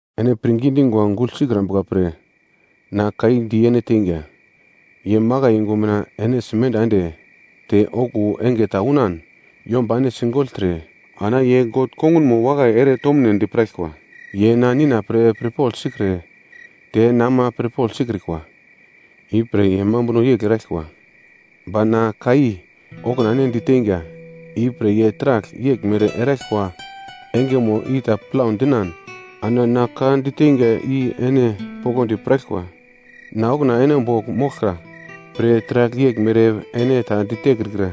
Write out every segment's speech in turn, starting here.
“Ene pirngi dingwa gugl sikrambuka pre, na ka i di ene teinga. Ye makai yungu mina ene simenda ende, te okuwo enge ta unan yomba ene sigogltre, ana ye God kongunmo wakai ere tomunedi piraglkwa. Ye na Nina pre pirpogl sikre te na ama pirpogl sikrikwa, ipre ye mambuno yegl eraglkwa. Ba na ka i okuna ene diteinga, ipre ye taragl yeglmere eraglkwa engemo i ta plau dinan ana na ka diteinga i ene poglodi piraglkwa. Na okuna ene bogl moglka pre taragl yeglmere ene ta ditekrikra.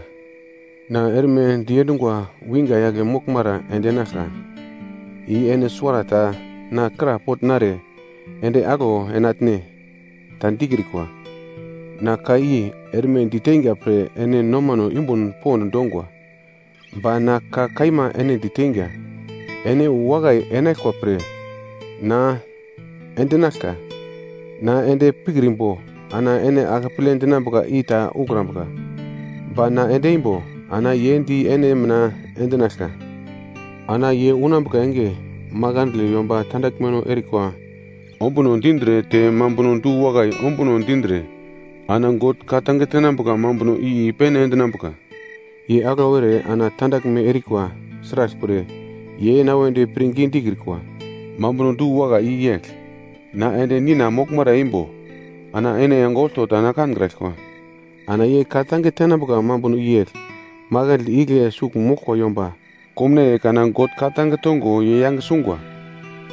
“Na erme diendungo winga yagle moglmara endinaglka, i ene suwarata na krapogl nare, ‘Ende aglo enatne?’ ta dikrikwa. Na ka i erme diteinga pre ene nomano yumbun pond dongwa. Ba na ka kaima ene diteinga, ene wu wakai enaglkwa pre na endinaglka. Na ende pikrimbo ana ene akeple dinambuka i ta ukrambuka. Ba na ende imbo ana ye di ene mina endinaglka. Ana ye unambuka enge, makandle yomba tandaglmeno erikwa ombuno dindre te mambuno du-wakai ombuno dindre ana God ka-tange tenambuka mambuno i i-pene endinambuka. Ye aglau ere ana tandaglme erikwa, sraglpre ye na wedi pirngi dikrikwa. Mambuno du-wakai i yegl, na ende Nina moglmara eimbo ana ene enge olto na kankraglkwa. Ana ye ka-tange tenambuka mambuno i yegl, makandle igle sugl moglkwa yomba komnaiye kana God ka-tange tongo ye yange sungwa.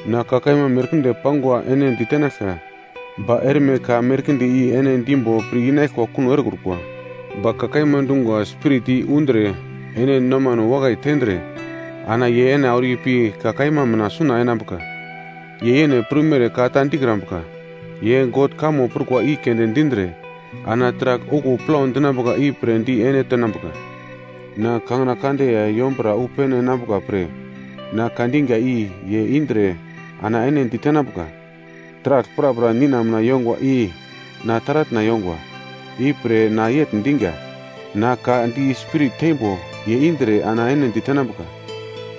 “Na ka merkinde pangwa ene ditenaglka, ba erme ka merkinde i ene dimbo pir-inaglkwa kuno erekrukwa. Ba ka kaima dungwa Spirit i undre ene nomano wakai tendre ana ye ene auro ipi ka kaima mina suna enambuka. Ye yene prumere ka ta dikrambuka, ye God kamo prukwa i keunde dindre, ana taragl okuwo plau dinambuka i pre di ene tenambuka. Na kangina kande ya yombura wu pene enambuka pre, na ka dinga i ye indre ana ene ditenambuka. Taragl prapra Nina mina yongwa i na taratna yongwa. Ipre na yegl dinga, na ka di Spirit teimbo ye indre ana ene ditenambuka.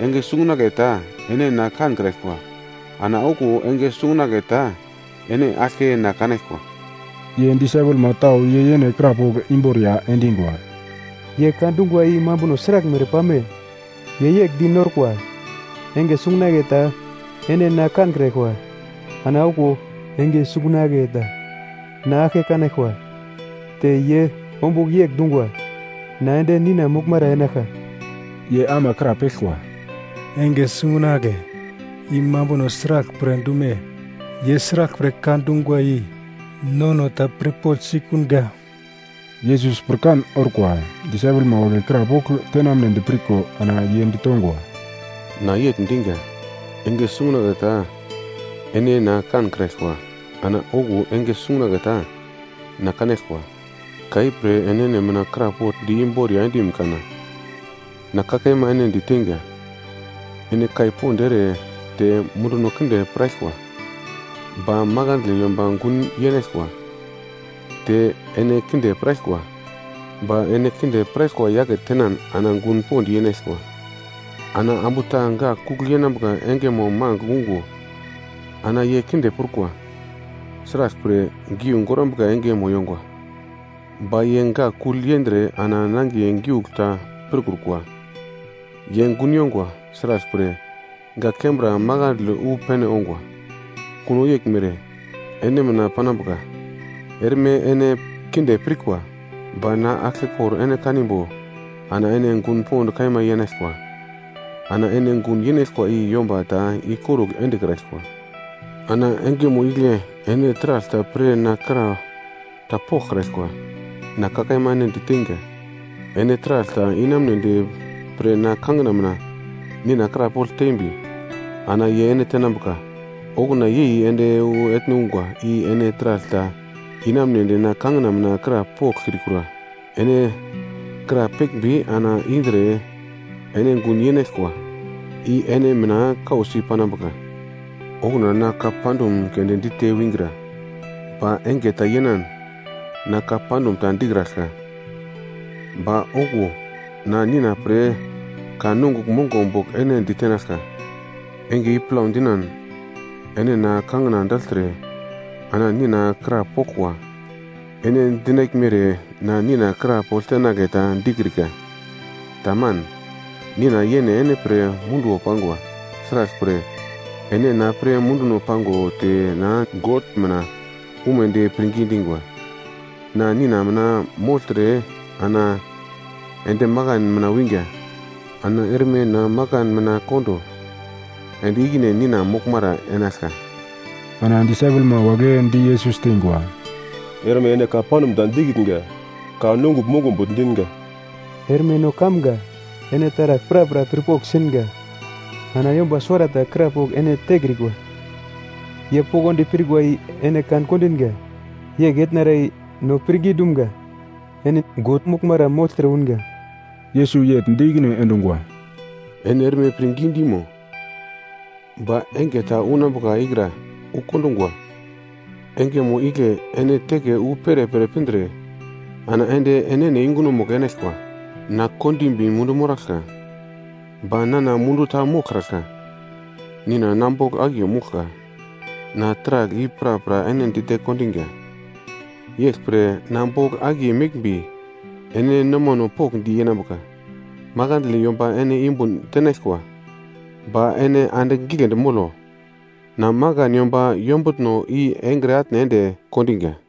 “Enge sungunagle ta ene na kankraglkwa, ana okuwo enge sungunagle ta ene aglke na kanaglkwa.” Ye disaipelma tau ye yene krapogl imboriya endingwa, “Ye ka dungwa i mambuno sraglmere pame? Ye yegl di norkwa, ‘Enge sungunagle ta ene na kankraglkwa, ana okuwo enge sungunagle ta na aglke kanaglkwa. Te ye ombugl yegl dungwa, na ende Nina moglmara enaglka?’” Ye ama krapeglkwa, “‘Enge sungunagle’ i mambuno sraglpre dume? Ye sraglpre ka dungwa i nono ta pirpogl sikunga.” Yesus pirkan orkwa disaipelma wagle krapogl tenamnedi pirko, ana ye ditongwa, “Na yegl dinga, ‘Enge sungunagle ta ene na kankraglkwa, ana okuwo enge sungunagle ta na kanaglkwa.’ Ka ipre enene mina krapogl di imboriya endim kana? Na ka kaima ene diteinga, ene kai pond ere te munduno kinde piraglkwa, ba makandle yomba gun yenaglkwa, te ene kinde piraglkwa, ba ene kinde piraglkwa yake tenan ana gun pond yenaglkwa. Ana ambu ta gak kugl yenambuka engemo magl ungo ana ye kinde prukwa, sraglpre giu gorambuka engemo yongwa, ba ye gak kugl yendre ana nangiye giugl ta pirkrukwa. Ye gun yongwa, sraglpre, gak kembra makandle wu pene ongwa. Kuno yeglmere ene mina panambuka, erme ene kinde pirkwa, ba na aglkekor ene kanimbo, ana ene gun pond kaima yenaglkwa. Ana ene gun yenaglkwa i yomba ta ikorugl endekraglkwa. Ana engemo igle ene taragl ta pre na kra ta poglkraglkwa. Na ka kaima ene di teinga: Ene taragl ta inamunedi pre na kangina mina Nina krapogl tembi, ana ye ene tenambuka. Okuna yei ende wu etne ungwa i ene taragl ta inamunedi na kangina mina krapoglkrikura, ene krapeglmbi ana indre ene gun yenaglkwa, i ene mina kausi panambuka. “Okuna na ka pandum keunde dite wingra, ba enge ta yenan na ka pandum ta dikraglka. Ba okuwo na Nina pre ka nongugl mongo bogl ene ditenaglka. Enge i plau dinan ene na kangina dagltre ana Nina kraporaglkwa. Ene dinaglmere na Nina krapogl tenagle ta dikrika. Taman, Nina yene ene pre munduwo pangwa, sraglpre ene na pre munduno pango, te na God mina umedi pirngi dingwa. Na Nina mina mogltre ana ende makan mina winga, ana erme na makan mina kondo, ende ikine Nina moglmara enaglka.” Ana disaipelma wagle di Yesus teingwa, “Erme ene ka pandum ta dikitnga, ka nongugl mongo bogl dinga. Erme no kamga, ene taragl prapra pirpogl singa, ana yomba suwarata krapogl ene tekrikwa. Ye poglodi pirkwa i ene kan-kondinga, yegl etnara i no pirngi dumga, ene God moglmara mogltre unga.” Yesus yegl di ikine endungwa, “Ene erme pirngi dimo? Ba enge ta unambuka ikra wu kondungwa. Engemo igle ene teke wu perepere pindre ana ende enene yungunomugl enaglkwa. Na kondimbi mundu moraglka, ba nana mundu ta moglkraglka, Nina na bogl akiye mouglka. “Na taragl i prapra ene dite kondinga. Yeglpre na bogl akiye meglmbi ene nomano pokndi yenambuka. Makandle yomba ene yumbun tenaglkwa, ba ene andigl giglendi molo, na makan yomba yombutno i engre atne ende kondinga.”